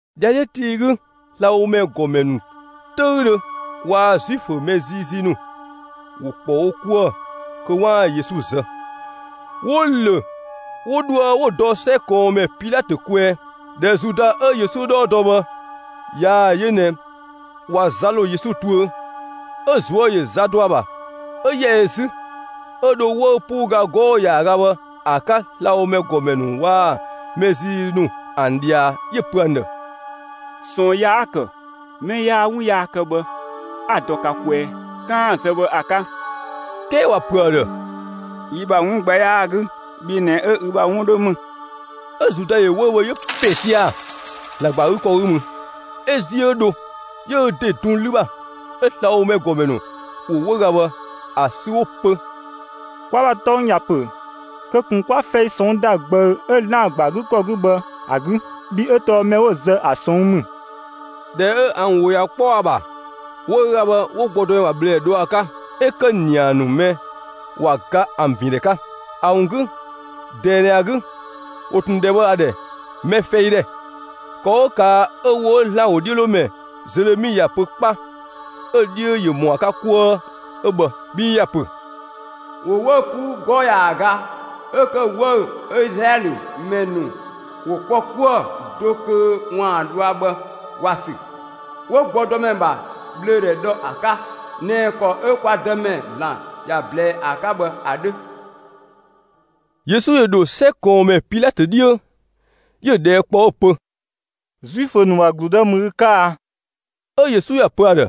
‑Dhiadhiö tii 'gü, slabhomɛ ‑gɔmɛ ‑nu 'töüdhö waa‑ Zuifö mɛ ziizii ‑nu ‑wo ‑kpɔ wo 'kuë‑ kö 'waan‑ Yesu zë. 'Wo‑ ‑lö 'wo dhoë 'wo‑ dɔ 'sɛ ꞊kɔɔnmɛ Pilatö kwɛɛ. ꞊Dhɛ Zuda 'ö Yesu 'dhɔɔ dɔ bhë ꞊yaa‑ yö ꞊nɛ ꞊wa za ‑lo Yesu tuö, 'ö‑ ꞊zuö' ‑yö za dɔ ‑a ‑bha, 'ö ‑yɛ ö 'zü, 'ö dho 'wëü‑ 'puu ga 'gɔɔ‑ ‑yaaga bhë ‑a 'ka slabhomɛ ‑gɔmɛ ‑nu waa‑ mɛ ziizii ‑nu ‑an ꞊dhia, 'yö‑ pö ‑an ‑dhë: «꞊Sɔɔn yaa 'a‑ ‑kë mɛ yaa 'wun yaa kë bhë, 'a‑ dɔ ka kwɛɛ 'kaan‑ ‑a zë bhë ‑a 'ka.» 'Kɛɛ ‑wa ‑pö ‑a ‑dhë: «Yi ‑bha 'wun gbɛ 'yaa‑ 'gü, bhi ꞊nɛ 'ö ü bha 'wun 'dhö ‑mü!» 'Ö Zuda ‑yö 'wëü‑ bhë 'yö‑ ‑pɛn sia‑ ‑Zlan ‑gba ‑a 'gü ‑kɔ 'gü mü, 'ö ‑ziö 'ö dho, 'yö ö ‑de dun 'lü ‑bha. 'Ö slabhomɛ ‑gɔmɛ ‑nu ‑wo 'wëüga bhë ‑a sü 'wo‑ pö: «Kwa ‑bha tɔng ‑ya ‑pö kö ꞊kun 'kwaa fɛi ꞊sɔnng' ‑da ꞊gbëü 'ö ‑Zlan ‑gba ‑a 'gü ‑kɔ 'gü bhë ‑a 'gü. Bhii 'ö tɔɔ mɛ 'wo‑ zë ‑a ꞊sɔnng' ‑mü.» ꞊Dhɛ 'ö ‑an ‑wo ꞊ya 'kpɔ ‑a ‑bha, 'wëüga bhë 'wo gbɔdɔmɛ ‑bha ꞊bhlöödhɛ dhɔ ‑a 'ka, 'ö ‑kë ‑nia ‑nu mɛ ꞊wa ga ‑an ‑bindhɛ 'ka. ‑A ‑wun 'gü ꞊dɛɛ ꞊nɛ ‑a 'gü, ‑wo ꞊tun ‑dhɛ bhë ‑a ‑dhɛ «mɛ fɛi ‑dhɛ». ‑Kɔ 'ö ꞊kaa' 'ö ‑wo 'ö ‑Zlan ‑wodhiölomɛ Zelemi ‑ya pö 'kpa 'ö‑ 'dhiö ‑yö ‑mɔ ‑a 'ka 'kuë 'ö bhë. Bhii ‑ya ‑pö: ‑Wo 'wëü‑ 'puu 'gɔɔ‑ ‑yaaga 'ö ‑kë 'wëü‑ 'ö Izlaɛlö ‑mɛ ‑nu ‑wo ‑kpɔ 'kuë‑ do kö ‑waan dhɔa bhë ‑wa ‑sü, 'wo gbɔdɔmɛ ‑bha ꞊bhlöödhɛ dhɔ ‑a 'ka ꞊nɛ ‑kɔ 'ö kwa Dëmɛ ‑Zlan ‑ya ꞊blɛɛ ‑a 'ka bhë ‑a 'dhö. Yesu ‑yö ‑dho 'sɛ ꞊kɔɔnmɛ Pilatö 'dhiö, 'yö‑ ꞊dhɛɛ' kpɔ 'ö‑ pö: «Zuifö ‑nu ‑bha ‑gludë ‑mü ü 'ka a?» 'Ö Yesu ‑ya pö ‑a ‑dhë: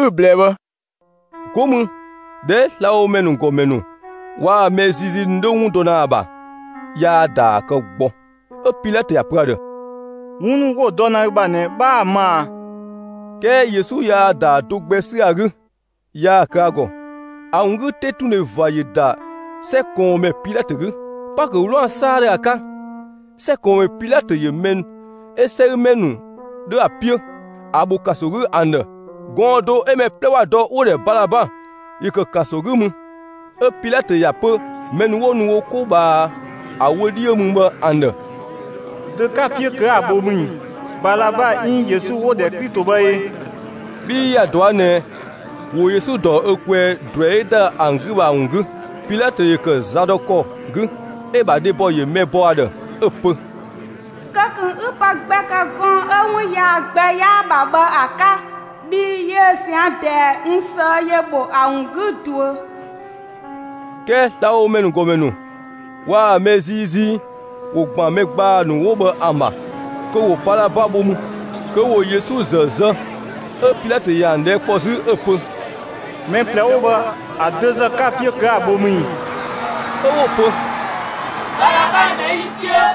«Ü‑ ꞊blɛɛ bhë.» Go mü ꞊dhɛ 'ö slabhomɛ ‑nu ‑gɔmɛ ‑nu waa‑ mɛ ziizii ‑nu 'dho 'wun dɔ ‑na ‑a ‑bha, yaa‑ ‑daa kë gbɔ. 'Ö Pilatö ‑ya pö ‑a ‑dhë: «'Wun ‑nu 'wo‑ dɔ ‑na ü ‑bha ꞊nɛ, 'bhaa‑ ma ꞊a?» 'Kɛɛ Yesu yaa‑ ‑daa do gbɛ 'sü ‑a 'gü, yaa‑ kë ‑a ‑gɔ. ‑A ‑wun 'gü 'tetundhe ꞊va ‑yö ‑da 'sɛ ꞊kɔɔnmɛ Pilatö 'gü. Paakö 'wlaan‑ 'saadhö ‑a 'ka, 'sɛ ꞊kɔɔnmɛ Pilatö ‑yö mɛ 'ö 'sɛgümɛ ‑nu 'dho ‑a 'piö, ‑a ‑bho ‑kanso 'gü ‑an ‑dhë. Gɔɔn‑ do 'ö mɛ 'plɛ ‑wa dɔ 'wo‑ ‑dhɛ Balaba, ‑yö ‑kë ‑kanso 'gü mü. 'Ö Pilatö ‑ya pö mɛ ‑nu 'wo nu wo 'ko ꞊bhaa ‑a wö 'dhiö mü bhë ‑an ‑dhë: «Dö 'ka‑ 'piö kö 'a‑ bho mü ꞊i? Balaba 'iin Yesu 'wo‑ ‑dhɛ Klito bhë e?» Bhii ‑ya ꞊dɔa' ꞊nɛ ‑wo Yesu ‑dɔ ö kwɛɛ ꞊druɛi 'ö ‑da ‑an 'gü bhë ‑a ‑wun 'gü. Pilatö ‑yö ‑kë zadɔkɔ 'gü, 'ö‑ ‑bha dhebɔ ‑yö mɛ ‑bɔ ‑a ‑dhë 'ö‑ pö: «Kö ꞊kun 'ü pë gbɛ ‑kë gɔɔn‑ 'ö 'wun yaa gbɛ 'yaa‑ ‑bha bhë ‑a 'ka! Bhii yiö ꞊zian' ꞊dɛɛ, n ꞊sëë'‑ ‑yö ‑bho ‑a ‑wun 'gü ꞊duö.» 'Kɛɛ slabhomɛ ‑nu ‑gɔmɛ ‑nu waa‑ mɛ ziizii ‑wo ‑gban mɛ ‑gbaa ‑nu 'wo bhë ‑an ‑bha, kö ‑wo Balaba bho mü, kö ‑wo Yesu ‑zë zë. 'Ö Pilatö ‑yö ‑an ꞊dhɛɛ' kpɔ 'zü 'ö‑ pö: «Mɛ ꞊plɛ 'wo bhë, ‑a dözë 'ka‑ 'piö kö 'a‑ bho mü ꞊i?» 'Ö 'wo‑ pö: «Balaba ꞊nɛ 'yi‑ 'piö!»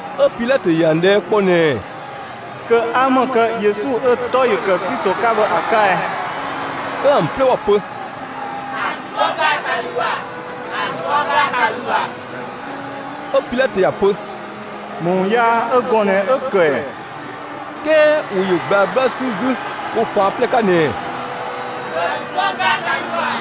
'Ö Pilatö ‑yö ‑an ꞊dhɛɛ' kpɔ ꞊nɛɛ: «Kö 'a ‑më kë Yesu 'ö‑ 'tɔ ‑yö ‑kë Klito 'ka bhë ‑a 'ka ɛ?» 'Ö ‑an 'plɛ ‑wa ‑pö: «‑A dɔ ‑gaatalü ‑bha!» 'Ö Pilatö ‑ya pö: «‑Më ‑wun yaa 'ö gɔɔn‑ ꞊nɛ 'ö‑ ‑kë ‑ɛ?» 'Kɛɛ ‑wo ‑yö ꞊gblaa 'gbla ‑sü 'gü wo ꞊faan' 'plɛ 'ka ꞊nɛɛ: «‑Bhö ‑a dɔ ‑gaatalü ‑bha!»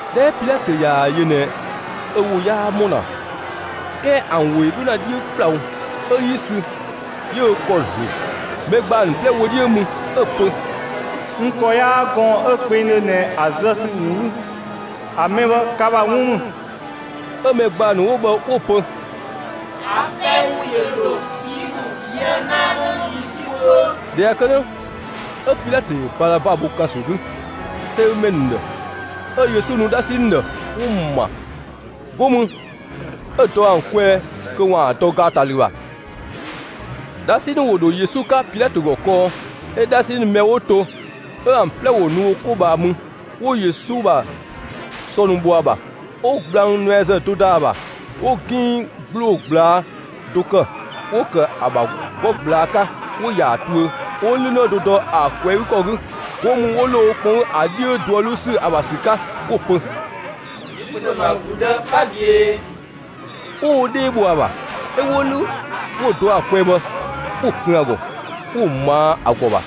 ꞊Dhɛ 'ö Pilatö ꞊yaa‑ yö ꞊nɛ ö ‑wo 'yaa ‑mɔ ‑na, 'kɛɛ ‑an ‑wo 'dho ‑na 'dhiö ‑kplawo, 'ö 'yi sü 'yö ö ‑kɔ ‑zlu, mɛ ‑gbaa ‑nu 'plɛ wö 'dhiö mü, 'ö‑ pö: «N ‑kɔ 'yaa gɔɔn‑ 'ö kpengdhö ꞊nɛ ‑a zë ‑sü ‑wun 'gü, ‑a mɛ bhë ka ‑bha 'wun ‑mü!» 'Ö mɛ ‑gbaa ‑nu 'wo bhë 'wo‑ pö: «‑A fɛi ‑wun ‑yö ‑lo yi ‑nu, yië‑ yi ‑bha 'në ‑nu, yi tuö!» ꞊Dhɛ ꞊ya kë 'dhö, 'ö Pilatö ‑yö Balaba bho ‑kanso 'gü 'sɛgümɛ ‑nu ‑dhë, 'ö Yesu nu 'dhasi ‑nu ‑dhë, 'wo‑ ‑ma. 'Go mü, 'ö‑ dɔ ‑an kwɛɛ kö 'waan‑ ‑a dɔ ‑gaatalü ‑bha. 'Dhasi ‑nu ‑wo ‑dho Yesu 'ka Pilatö ‑gɔ kɔɔ, 'ö 'dhasi ‑nu mɛ 'wo to 'ö ‑an 'plɛ ‑wo nu wo 'ko ꞊bhaa mü. 'Wo Yesu ‑bha sɔ ‑nu bho ‑a ‑bha, 'wo gblang nuɛazë do ‑da ‑a ‑bha, 'wo 'ginng ‑gbloo ꞊gblaa' do ‑kë, 'wo‑ ‑kë ‑a ‑bha 'gɔ ꞊gblaa' 'ka, 'wo‑ ‑ya ‑a tuö, 'ö 'wo 'lünë do dɔ ‑a ꞊kwɛɛ‑ 'gü ‑kɔ 'gü. 'Go mü, 'wo ‑lo wo kpɔn 'gü ‑a 'dhiö duö 'luu ‑sü ‑a ‑bha ‑sü 'ka, 'wo‑ pö: «Zuifö ‑nu ‑bha ‑gludë, 'bha ꞊büee!» 'Wo wo 'dhee bho ‑a ‑bha, 'ö 'wo 'lü 'wo‑ dɔ ‑a kwɛɛ bhë, 'wo‑ kun ‑a ‑gɔ, 'wo‑ ꞊maa' ‑a ‑gɔ ‑bha.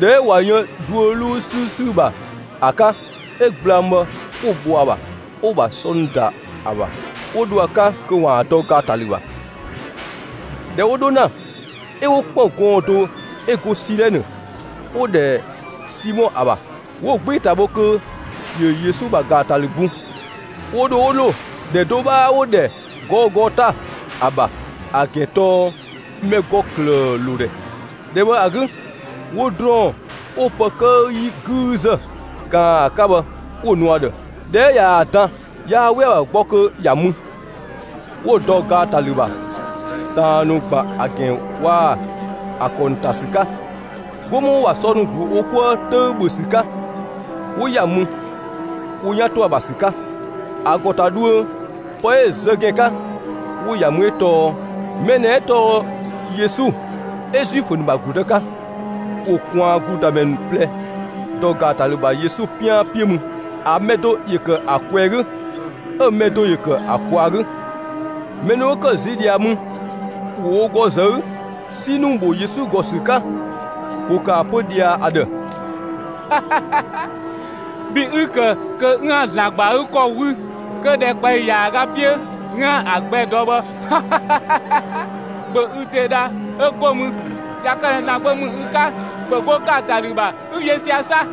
꞊Dhɛ 'ö ꞊wa yën duö 'luu 'sü ‑sü ‑bha ‑a 'ka, 'ö gblang bhë 'wo‑ bho ‑a ‑bha, 'wo‑ ‑bha sɔ ‑nu ‑da ‑a ‑bha; 'wo dho ‑a 'ka kö ‑waan dɔ ‑gaatalü ‑bha. ꞊Dhɛ 'wo 'dho ‑na, 'ö 'wo ‑kpën gɔɔn‑ do 'ö go Silɛnë, 'wo‑ ‑dhɛ Simɔ ‑a ‑bha, 'wo‑ 'gbee‑ ‑ta bho kö ‑yö Yesu ‑bha ‑gaatalü bun. 'Wo dho 'wo ‑lo ‑dhɛ do 'bhaa 'wo‑ ‑dhɛ «Gɔɔgota» ‑a ‑bha, ‑a ‑gɛn 'ö tɔɔ «mɛ ‑gɔ ‑klëë ‑lo ‑dhɛ». ‑Dhɛ bhë ‑a 'gü, 'wo ‑drɔɔn 'wo pë 'këü 'yi 'güüzë ꞊kaan ‑a 'ka bhë 'wo‑ nu ‑a ‑dhë. ꞊Dhɛ 'ö ꞊yaa‑ dan, yaa 'we ‑a ‑bha gbɔ kö ‑ya mü. 'Wo‑ dɔ ‑gaatalü ‑bha ꞊taan ‑nu ‑gban ‑a ‑gɛn waa‑ ‑a ‑kɔ ‑nu ‑an ‑ta ‑sü 'ka. 'Go mü 'wo‑ ‑bha sɔ ‑nu ‑glu wo 'ko 'ka 'töü‑ ‑bhö ‑sü 'ka, 'wo ‑ya mü, wo 'yan ‑to ‑a ‑bha ‑sü 'ka. ‑A ‑gɔ ‑ta dhuö pë 'ö‑ zë ‑gɛn 'ka, 'wo‑ ‑ya mü 'ö tɔɔ: «Mɛ ꞊nɛ 'ö tɔɔ Yesu 'ö Zuifö ‑nu ‑bha ‑gludë 'ka.» ‑Wo ꞊kwaan ‑gludamɛ ‑nu ꞊plɛ ‑dɔ ‑gaatalü ‑bha Yesu 'pian 'piö mü; ‑a mɛ do ‑yö ‑kë ‑a ꞊kwɛɛ‑ 'gü, 'ö‑ mɛ do ‑yö ‑kë ‑a ꞊kwaa‑ 'gü. Mɛ ‑nu 'wo ‑kë ziö ꞊dhia mü, ‑wo wo ‑gɔ zë 'gü 'si ‑nu ‑bho Yesu ‑gɔ ‑sü 'ka. ‑Wo ‑kë ‑a pö ꞊dhia ‑a ‑dhë: «Bhi 'ü‑ ‑kë kö 'üën‑ ‑Zlan ‑gba ‑a 'gü ‑kɔ 'wü, kö ‑dhɛkpaɔyi ‑yaaga 'piö 'üën‑ ‑a gbɛ dɔ bhë, ‑bhö ü ‑de dha; 'ö 'go mü, ꞊ya kë ꞊nɛ ‑Zlan Gbö ‑mü ü 'ka, ‑bhö 'go ‑gaatalü ‑bha 'ü yö sia‑ 'sa!»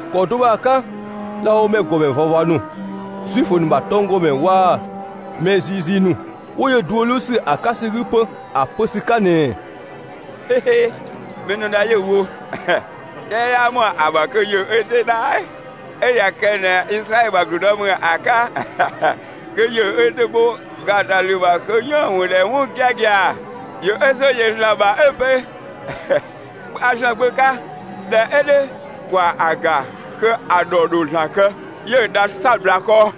‑Kɔ do bhë ‑a 'ka slabhomɛ ‑gɔmɛ ꞊vava ‑nu, Zuifö ‑nu ‑bha tɔnggɔmɛ ‑nu waa‑ mɛ ziizii ‑nu, 'wo yö duö 'luu ‑sü ‑a 'ka ‑sü 'gü 'pö, ‑a pö ‑sü 'ka ꞊nɛɛ: «Mɛ ‑nu dha 'yö‑ wo, 'kɛɛ 'yaa ‑mɔ ‑a ‑bha kö ‑yö ö ‑de dha! 'Ö ꞊ya kë ꞊nɛ Izlaɛlö ‑bha ‑gludë ‑mü ‑a 'ka, kö ‑yö ö ‑de bho ‑gaatalü ‑bha kö 'yiën‑ ‑a ‑wo ‑dhɛ 'wun giagia. ‑Yö ö ‑zo yö ‑Zlan ‑bha 'ö‑ pö: ‹A ‑Zlan Gbö 'ka›; ꞊dhɛ 'ö 'dhö, ‑kwa ‑a ‑ga kö ‑a ‑dhɔ ‑dho ‑Zlan kë, 'yö‑ dha 'sabla kɔ.»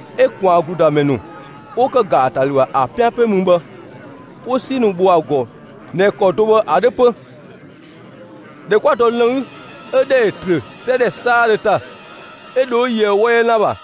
'Ö ꞊kwaan ‑gludamɛ ‑nu 'wo ‑kë ‑gaatalü ‑bha ‑a 'piö mü bhë, 'wo 'si ‑nu ‑bho ‑a ‑gɔ ꞊nɛ ‑kɔ do bhë ‑a 'dhö 'pö. ꞊Dhɛ 'kwa dɔ lënngü, 'ö ‑dhɛ ‑yö ‑trö 'sɛ ‑dhɛ 'saadhö ‑ta, 'ö dho 'ö yöë 'wɔ 'yɛ ‑lan ‑bha.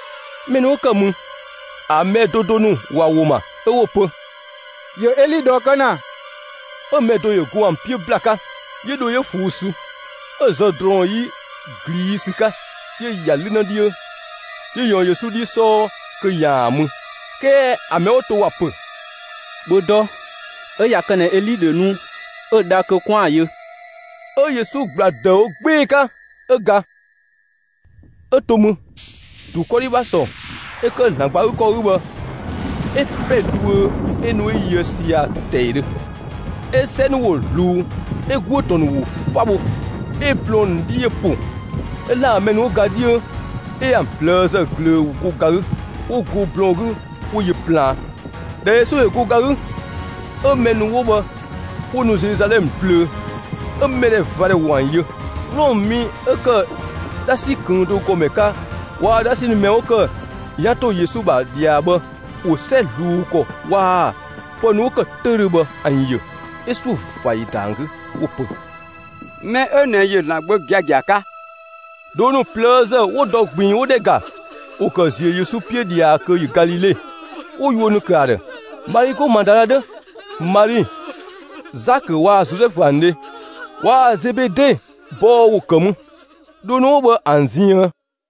Mɛ ‑nu 'wo ‑kë mü, ‑a mɛ do do ‑nu ‑wa ‑wo ‑ma, 'ö 'wo‑ pö: «‑Yö Eli ꞊dhɔɔ kë ‑na!» 'Ö mɛ do ‑yö go ‑an 'gü ‑bla 'ka, 'yö dho 'yö ꞊fuu'‑ sü, 'ö‑ zë ‑drɔɔn 'yi ꞊gliisü 'ka, 'yö‑ ‑ya 'lünë 'dhiö, 'yö‑ ꞊yɔɔn Yesu 'dhi 'sɔɔ kö ‑yaan ‑a mü. 'Kɛɛ ‑an mɛ 'wo to ‑wa pö: «‑Bhö dɔ, 'ö ꞊ya kë ꞊nɛ Eli ‑dho nu 'ö‑ dha kö 'kwaan‑ ‑a yö.» 'Ö Yesu ‑gbla ‑dëüwo 'gbee‑ 'ka 'ö ga. 'Ö to mü, ‑dun 'kɔdhi ‑bha ‑sɔ 'ö ‑kë ‑Zlan ‑gba ‑a 'gü ‑kɔ 'gü bhë, 'ö ‑pɛ dhuö 'ö nu 'ö yöë sia‑ ‑tɛidhö; 'ö 'sɛ ‑nu ‑wo ꞊zluun, 'ö ‑guö ‑tɔn ‑nu ‑wo 'fa bho. 'Ö blɔɔn‑ ‑nu 'dhi ‑yö ‑po, 'ö ‑Zlan ‑bha mɛ ‑nu 'ö 'wo ga 'dhiö, 'ö ‑an ꞊plëëzë ꞊glöö ‑wo go ga 'gü, 'wo go blɔɔn‑ 'gü 'wo yö plaan. ꞊Dhɛ Yesu ‑yö go ga 'gü, 'ö mɛ ‑nu 'wo bhë 'wo nu Zeluzalɛmë plöö, 'ö mɛdhɛvadhɛ ‑wo ‑an yö. Wlɔmë mi 'ö ‑kë 'dhasi ꞊këng' do ‑gɔmɛ 'ka waa‑ 'dhasi ‑nu mɛ 'wo ‑kë wo 'yan ‑to Yesu ‑bha ꞊dhia bhë ‑wo 'sɛ ꞊zluun ‑kɔ waa‑ pë ‑nu 'wo ‑kë 'töüdhö bhë ‑an ‑yö. 'Ö 'suö ꞊va ‑yö ‑da ‑an 'gü 'wo‑ pö: «Mɛ 'ö ꞊nɛ ‑yö ‑Zlan Gbö giagia 'ka!» Dhoo ‑nu ꞊plëëzë 'wo dɔ ꞊gbiin 'wo ‑dhɛ ‑ga, ‑wo ‑kë ‑ziö Yesu 'piö ꞊dhia kö ‑yö Galile, 'wo yuö ‑nu ‑kë ‑a ‑dhë. Mali 'go Madala 'dhö, Mali Zakö waa‑ Zozɛfu ‑an dhe, waa‑ Zebede bɔɔ ‑wo ‑kë mü, dhoo ‑nu 'wo bhë ‑an ziën.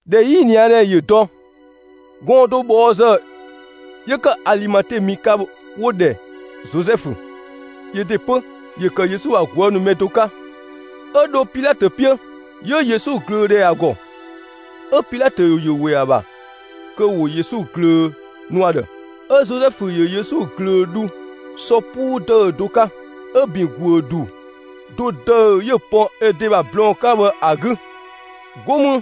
꞊Dhɛ 'yiniadhɛ ‑yö dɔ, gɔɔn‑ do ꞊bhɔɔzë 'yö ‑kë Alimate mi 'ka 'wo‑ ‑dhɛ Zozɛfu, yö ‑de 'pö ‑yö ‑kë Yesu ‑bha ꞊guë' ‑nu mɛ do 'ka, 'Ö dho Pilatö 'piö, 'yö Yesu ꞊glöö ‑dhɛ ‑a ‑gɔ. 'Ö Pilatö ‑yö ‑we ‑a ‑bha kö ‑wo Yesu ꞊glöö nu ‑a ‑dhë. 'Ö Zozɛfu ‑yö Yesu ꞊glöö dhu sɔ 'puu ‑dëü do 'ka, 'ö‑ ‑bin ‑guö ‑du do ‑dëü 'yö‑ pɔn ö ‑de ‑bha blɔɔn‑ 'ka bhë ‑a 'gü. 'Go mü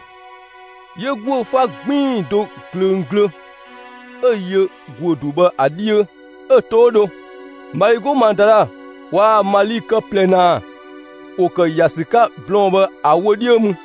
'yö ‑guö 'fa 'gbiin‑ do ꞊glöng glö 'ö‑ yö ‑guö ‑du bhë ‑a 'dhiö, 'ö‑ to 'ö dho. Mali 'go Madala waa‑ Mali kë ꞊plɛ ‑naa, ‑wo ‑kë ‑ya ‑sü 'ka blɔɔn‑ bhë ‑a wö 'dhiö mü.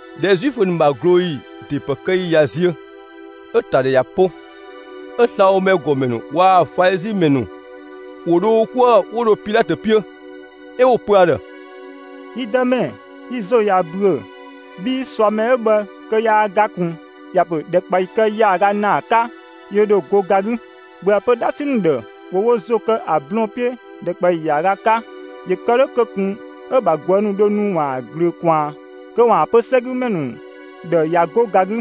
꞊Dhɛ Zuifö ‑nu ‑bha ꞊glooyi ‑de ‑pë kë ‑yi ꞊ya ziö, 'ö‑ ‑ta ‑dhɛ ꞊ya 'po, 'ö slabhomɛ ‑gɔmɛ ‑nu waa‑ Falizi ‑mɛ ‑nu ‑wo dho wo 'kuë‑ 'wo dho Pilatö 'piö. 'Ö 'wo‑ pö ‑a ‑dhë: «Yi dëmɛ, yi ‑zo ꞊ya ‑büö bhii ꞊suamɛ 'ö bhë kö yaa ga ꞊kun, ‑ya ‑pö ‑dhɛkpaɔyi kë ‑yaaga ‑naa 'ka, ‑yö ‑dho go ga 'gü. ‑Bhöë pö 'dhasi ‑nu ‑dhë ‑wo wo ‑zo ‑kë ‑a blɔɔn‑ 'piö ‑dhɛkpaɔyi ‑yaaga 'ka, ‑yö kë 'dhö kö ꞊kun 'ö‑ ‑bha ꞊guë' ‑nu dho nu ‑waan ‑a ꞊glöö ꞊kwaan, kö ‑waan pö 'sɛgümɛ ‑nu ‑dhë ꞊ya 'go ga 'gü.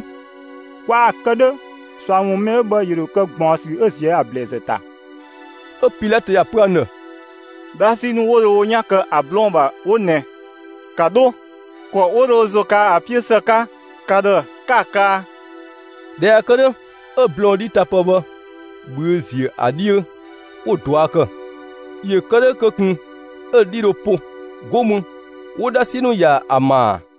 Kwaa‑ kë 'dhö, ꞊sua ‑wun ‑mɛ 'ö bhë ‑yö ‑dho kë ꞊gbaɔnsü 'ö ꞊zië' ‑a ‑blɛɛzë ‑ta.» 'Ö Pilatö ‑ya pö ‑an ‑dhë: «'Dhasi ‑nu 'wo dho wo 'yan to ‑a blɔɔn‑ ‑bha 'wo ꞊nɛ. ‑Ka 'dho, ‑kɔ 'wo dho wo ‑zo kaa ‑a 'piö ‑së 'ka ka ‑dhë, 'ka‑ kaa!» ꞊Dhɛ ꞊ya kë 'dhö, 'ö blɔɔn‑ 'dhitapë bhë ꞊bhüö' ‑ziö ‑a 'dhiö, 'wo‑ ꞊dua' ‑kë, ‑yö kë 'dhö kö ꞊kun 'ö‑ 'dhi dho po. 'Go mü, 'wo 'dhasi ‑nu ‑ya ‑a ‑maa.